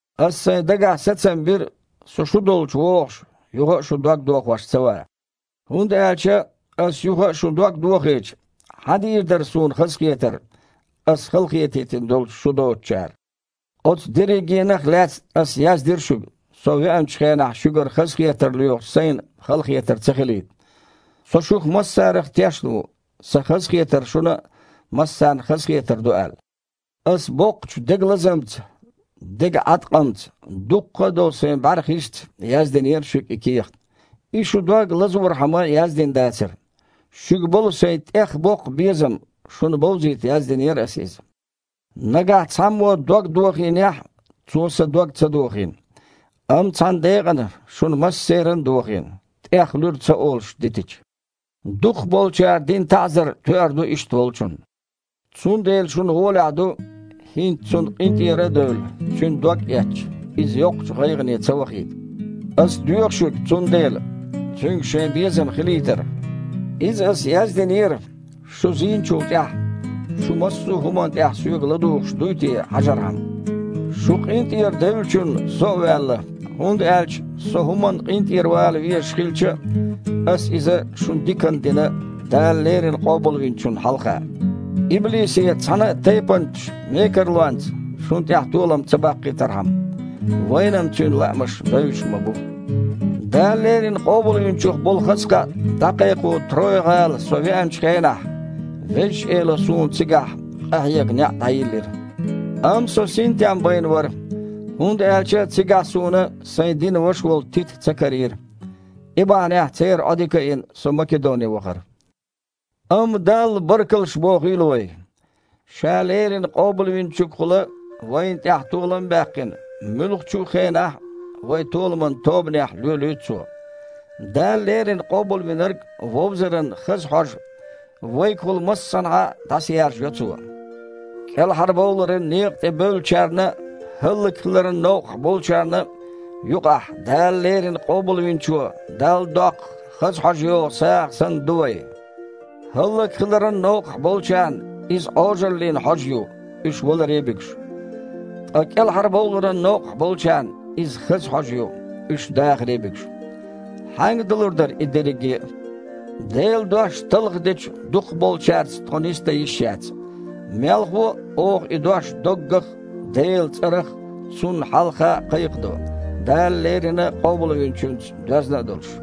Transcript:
Аса сайн дагахь сацам бира, со шу долчу вогІуш, юха а шун дог дохош ца ван. ХІунда аьлча аса юха а шун дог дохийча, хьан дийр дара суна хазахетар, аса халахетийтина долчу шу доцучара? Оцу дерригенах а лаьцна аса яздира шуьга, со веанчу хенахь шуьгара хазахетар лоьхучу сайна халахетар ца хилийта. Со шух массарах тешна ву, сан хазахетар шуна а массарна хазахетар ду аьлла. Аса боккхачу дегалазамца, дегаІаткъамца, дуккха а долу сайн бІаьрхишца яздинера шуьга и кехат. Иза шун дог лазорхьама яздина дацара. Шуьга болу сайн тІех боккха безам шуна бовзийта яздинера аса иза. Нагахь цхьаммо дог дохийнехь а, цо сан дог ца дохийна, амма цхьана декъана шун массеран а дохийна, тІех луьра ца олуш дитича. Дукхахболчара дина таІзар тоьар ду иштта волчунна. Цундела шуна гІолехь ду, хІинца цунна къинтІера а девлла, цуьнан догъэцча, иза йоккхачу гІайгІане ца вахийта. Аса доьху шуьга цундела, цуьнга шайн безам хилийтар. Иза аса яздинера, шу зийначул тІаьхьа, шу массо а хІуманна тІехь соьга ладугІуш дуй те хьажархьама. Шу къинтІера девллачунна со а ваьлла, хІунда аьлча со хІуманна къинтІера вала везаш хилча а, аса иза шуна диканна дина Дала леррина Къобалвинчунна хьалха, иблисе цхьана а тайпанчу мекарлонца шуна тІехь толам ца баккхийтархьама. Вайна-м цуьнан лаамаш бевзаш ма бу. Дала леррина Къобалвинчух болу хаза кхаъ дІакхайкхо Троя-гІала со веанчу хенахь, Везачу Эло суна цигахь къахьега неІ дІайиллира. Амма со синтем байна вара, хІунда аьлча цигахь суна сайн динан ваша волу Тита ца карийра. И бахьанехь, церан Іодика а йина, со Македоне вахара. Амма Далла баркаллаш бохийла вай! Ша леррина Къобалвинчуьнгахула вайна тІехь толам а баьккхина, муьлххачу хенахь а вай толаман тобанехь лоьлуьйту Цо. Дала леррина Къобалвинарг вовзаран хаза хьожа вайгахула массанхьа а дІасаяржайо Цо. КІелхьарбовларан некъа тІе бевллачарна а, хІаллакьхиларан новкъахь болчарна а юкъахь Дала леррина Къобалвинчо Далла доккху хаза хьожа йогІу сагІа санна ду вай. ХІаллакьхиларан новкъахь болчарна иза Іожаллин хьожа ю, уьш валаре а буьгуш. Ткъа кІелхьарбовларан новкъахь болчарна иза хаза хьожа ю, уьш дахаре а буьгуш. Хьаьнга далур дара и дерриге а? Делан дош талхадечу дукхахболчаьрца тхо нисдан йиш яц. Мелхо а, оха и дош доггах а, Делан цІарах а, Цунна хьалха а кхайкхадо, Дала леррина Къобалвинчуьнца доьзна а долуш.